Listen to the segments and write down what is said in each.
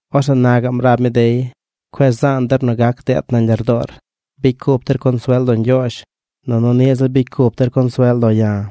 Orzeꞌ na gaꞌm rab mi dey: ―Cueꞌ zaan der nu gac deet nañ lardoor. Bicy cup der consuel lo Ñgyoozh, nunu niꞌ ziꞌl bicy cup der consuel lo̱ ya̱.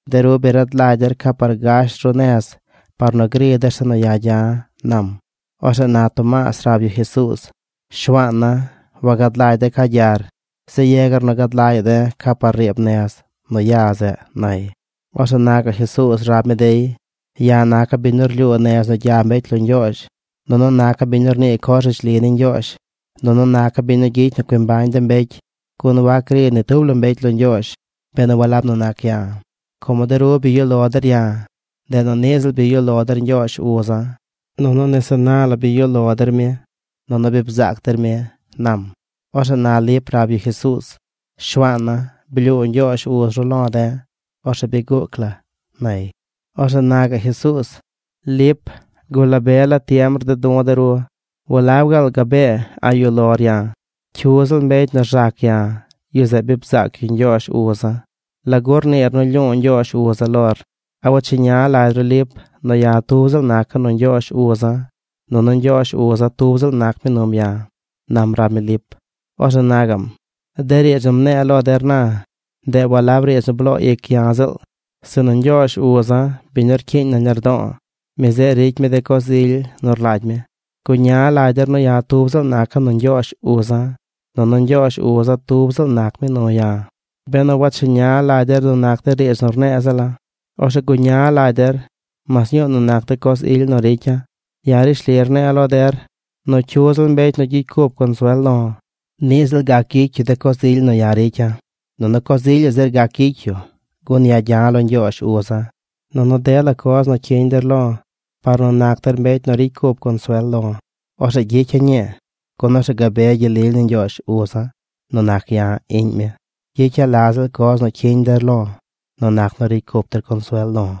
De ru bi rad lagy der ca par gash ru nez par nu gri der zeꞌ nu ya̱ gya̱ ―nam. Orzeꞌ na Tomaas rab yu Jesuuz: ―Shuaana̱, wagad lagy de̱ ca gyar. Yegar nu gad lagya̱ꞌ de̱ ca par riib nez nu ya zeꞌ ―nay. Orzeꞌ na gaꞌ Jesuuz rab mi dey: ―Ya̱ naca̱ biñ nu rlyuu nez nu gya mbecy lo Ñgyoozh, nunu naca̱ biñ nu rnii coz rishli ni Ñgyoozh, nunu naca̱ biñ nu gyicy nu cui mbañ de mbecy. Gun wac gri ni tub la mbecy lo Ñgyoozh benu walab nu nac ya̱. Como de ru bi yuꞌ lo der ya̱, ndeꞌ nu niꞌ ziꞌl bi yuꞌ lo der Ñgyoozh uza̱. Nunu nese na la bi yuꞌ lo der mi. Nunu bi bzaac der mi ―nam. Orzeꞌ na Lip rab yu Jesuuz: ―Shuaana̱, blyuu Ñgyoozh uz ru lo̱ de̱. Orzeꞌ bi guuc la ―nay. Orzeꞌ na gaꞌ Jesuuz: ―Lip, gula be la tiem rded du̱ de ru. ¿Walab gaal gabee a̱ꞌ yuꞌ lor ya̱? Cyu ziꞌl mbecy nu rzac ya, yu zeꞌ bi bzaac yu Ñgyoozh uza̱. ¿Lagu rniir nu lyu̱u̱ Ñgyoozh uza̱ lor? ¿A wacheña lagy ru Lip nu ya̱ tub ziꞌl naca̱ nu Ñgyoozh uza̱, nunu Ñgyoozh uza̱ tub ziꞌl nac mi num ya̱? ―nam rab mi Lip. Orzeꞌ na gaꞌm: ―De riidz nu mne̱e̱ lo der na, ndeꞌ walab riidz nu bloo ic ya̱ ziꞌl, sinu Ñgyoozh uza̱, biñ nu rcyiiñ nañ lardo̱o̱, mi zeꞌ ricy mi de coz ily nu rlagy mi. Guña lagy der nu ya̱ tub ziꞌl naca̱ nu Ñgyoozh uza̱, nunu Ñgyoozh uza̱ tub ziꞌl nac mi nu ya̱. Benu wacheña lagy der nu nac de riidz nu rne̱e̱ ziꞌl la, orzeꞌ guña lagy der mas ñuu nu nac de coz ily nu ricya̱. Ya̱ rishli rne̱e̱ lo der nu cyu ziꞌl mbecy nu gyicy cup consuel lo̱, niꞌ ziꞌl gac gyicy yu de coz ily nu ya̱ ricya̱, nunu coz ilyaꞌ zir gac gyicy yu, gun ya̱ gya̱ lo Ñgyoozh uza̱. Nunu dela coz nu cyiñ der lo̱ par nu nac der mbecy nu ricy cup consuel lo̱, orzeꞌ gyicya̱ ñii, gun orzeꞌ gabe gyel lily ni Ñgyoozh uza̱ nu nac ya̱, iꞌñ mi. Gyicya̱ la ziꞌl coz nu cyiñ der lo̱ nu nac nu ricy cup der consuel lo̱.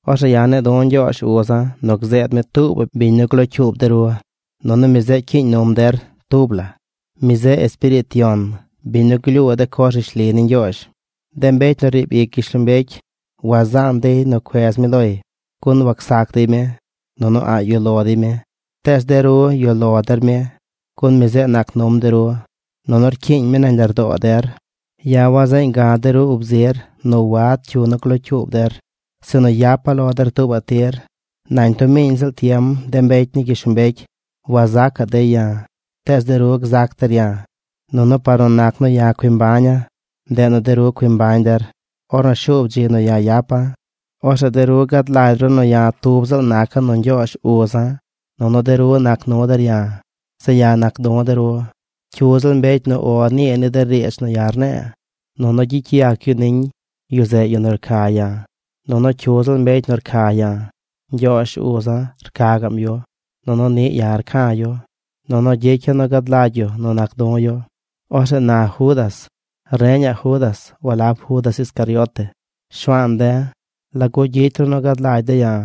Orzeꞌ ya̱ ne̱e̱ du̱ Ñgyoozh uza̱ nu gzeed mi tuubaꞌ biñ nu glocyuub de ru. Nunu mi zeꞌ cyiiñ num der tub la. Mi zeꞌ Espiriit Yon, biñ nu glyuu de coz rishli ni Ñgyoozh. De mbecy nu riib ic gyishlombecy wazaan dey nu cuez mi loy. Gun wacsac dey mi. Nunu a̱ꞌ yuꞌ lo dey mi. Tees de ru yuꞌ lo der mi, gun mi zeꞌ nac num de ru, nunu rcyiiñ mi nañ lardoo der. ’Ya̱ wazeeñ ga̱ de ru ub zir nu wad cyu nu glocyuub der. Sinu yapa̱ lo der tuubaꞌ tir. Nañ tub miꞌ ziꞌl tiem de mbecy ni gyishlombecy wazacaꞌ dey ya̱. Tees de ru gzac der ya̱. Nunu par nu nac nu ya̱ cui mbaña̱, ndeꞌ nu de ru cui mbañ der. Ornu shuub dzi nu ya̱ yapa̱, orzeꞌ de ru gad lagy ru nu ya̱ tub ziꞌl naca̱ nu Ñgyoozh uza̱, nunu de ru nac nu der ya̱. Zeꞌ ya̱ nac du̱ de ru. Cyu ziꞌl mbecy nu “O” nii ni de riidz nu ya̱ rne̱e̱, nunu gyicy yac yu niñ, yu zeꞌ yu nu rca ya̱. Nunu cyu ziꞌl mbecy nu rca ya̱, Ñgyoozh uza̱ rca gaꞌm yu. Nunu niꞌ ya̱ rca̱ yu. Nunu gyicya̱ nu gad lagy yu nu nac du̱ yu. Orzeꞌ na Judas (reñaꞌ Judas, walab Judas Iscariote): ―Shuaan de̱, ¿lagu gyicy ru nu gad lagy de̱ ya̱,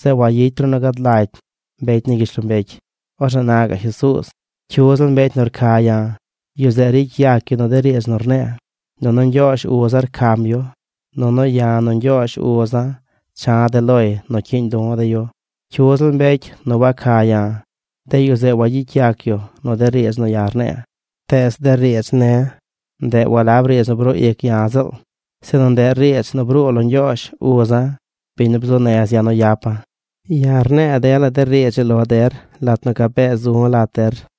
zeꞌ wayicy ru nu gad lagy de mbecy ni gyishlombecy? Orzeꞌ na gaꞌ Jesuuz: ―Cyu ziꞌl mbecy nu rca ya̱, yu zeꞌ ricy yac yu nu de riidz nu rne̱e̱. Nunu Ñgyoozh uza̱ rcam yu. Nunu ya̱ nu Ñgyoozh uza̱ cha̱ de̱ loy nu cyiiñ du̱ de̱ yu. Cyu ziꞌl mbecy nu waca ya̱, de yu zeꞌ wagyicy yac yu nu de riidz nu ya̱ rne̱e̱. Tees de riidz ne̱, ndeꞌ walab riidz nu bruu ic ya̱ ziꞌl, sinu ndeꞌ riidz nu bruu lo Ñgyoozh uza̱, biñ nu bzuu nez ya̱ nu yapa̱. ’Ya̱ rne̱e̱ dela de riidz ii lo der lat nu gabee zu̱ lat der.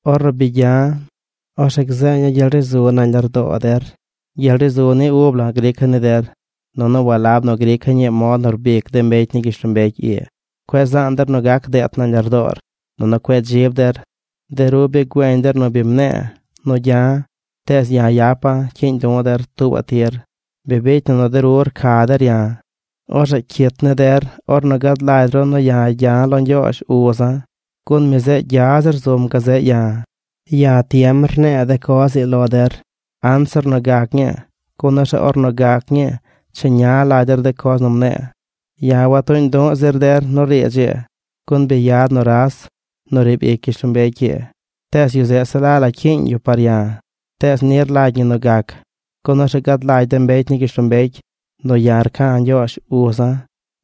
’Ornu bi gya̱, orzeꞌ gzeeña̱ gyel ri zu nañ lardoo der. Gyel ri zu ni ub la̱ grica̱ ni der, nunu walab nu grica̱ ñii mod nu rbic de mbecy ni gyishlombecy ii. Cueꞌ zaan der nu gac deet nañ lardoor, nunu cueꞌ dzib der. De ru bi güeñ der nu bi mne̱e̱ nu gya̱. Tees ya̱ yapa̱ cyiiñ du̱ der tubaꞌ tir. Bi bicy na nu de ru rca der ya̱, orzeꞌ cyit ni der ornu gad lagy ru nu ya̱ gya̱ lo Ñgyoozh uza̱, gun mi zeꞌ gya zir zum gazeꞌ ya̱. Ya̱ tiem rne̱e̱ de coz ii lo der, anzir nu gac ñii, gun orzeꞌ ornu gac ñii, cheña lagy der de coz nu mne̱e̱. ’Ya̱ watuuñ du̱ꞌ zir der nu riidz ii, gun bi yad nuras, yu nu riib ic gyishlombecy ii. Tees yu zeꞌ se la la cyiiñ yu par ya̱. Tees ni rlagy ñi nu gac, gun orzeꞌ gad lagy de mbecy ni gyishlombecy nu ya̱ rca̱ Ñgyoozh uza̱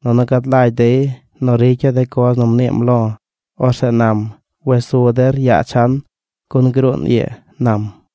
nunu gad lagy dey nu ricya̱ de coz nu mniim lo̱. Orzeꞌ nam: ―Wes su der yaa chan, gun gruun ii ―nam.